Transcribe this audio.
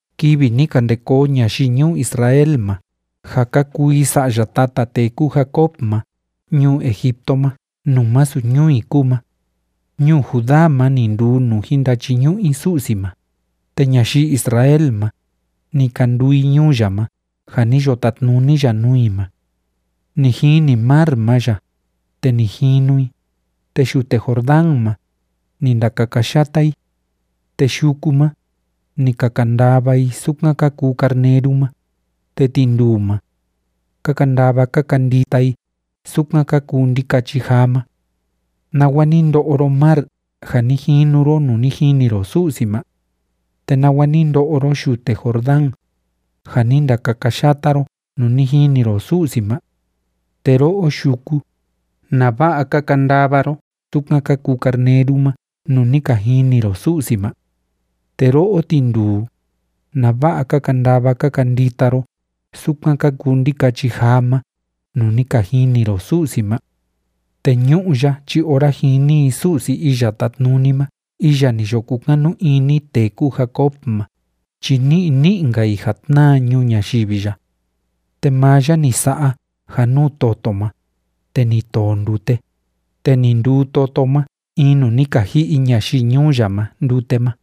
Kivi ni ka nde koo ñayii ñuu Israel ma ja ka kuu i sa'ya tata tee kúu Jacob ma ñuu Egipto ma nuu másu ñuu i kúu ma, ñuu Judá ma ni nduu nuu jin ndachiñu'u i Su'si ma, te ñayii Israel ma, ni ka nduu i ñuu ya ma ja ni yo tatnuni ya nuu i ma. Ni jini mar ma ya, te ni jinu i, te yute Jordán ma, ni ndakakayata i. Te yuku ma, ni ka kandava i sukan ka kuu carneru ma, te tinduu ma, ka kandava ka kandita i sukan ka kuu ndikachi jaa ma. ¿Nawa ni ndo'o ro, mar, ja ni jinu ro nuu ni jini ro Su'si ma? ¿Te nawa ni ndo'o ro, yute Jordán, ja ni ndakakayata ro nuu ni jini ro Su'si ma? Te ro'o, yuku, ¿nava'a ka kandava ro sukan ka kuu carneru ma nuu ni ka jini ro Su'si ma? Te ro'o, tinduu, ¿nava'a ka kandava ka kandita ro sukan ka kuu ndikachi jaa ma nuu ni ka jini ro Su'si ma? Te ñu'ú ya chi ora jini i Su'si Iya Tátnuni ma iya ni yo kukanu ini tee kúu Jacob ma chi ni'i ni'i‑nka i ja tnáa ñuu ñayivi ya. Te maa ya ni sa'a ja nuu toto ma, te ni too ndute, te ni nduu toto ma in nuu ni ka ji'i ñayii ñuu ya ma ndute ma.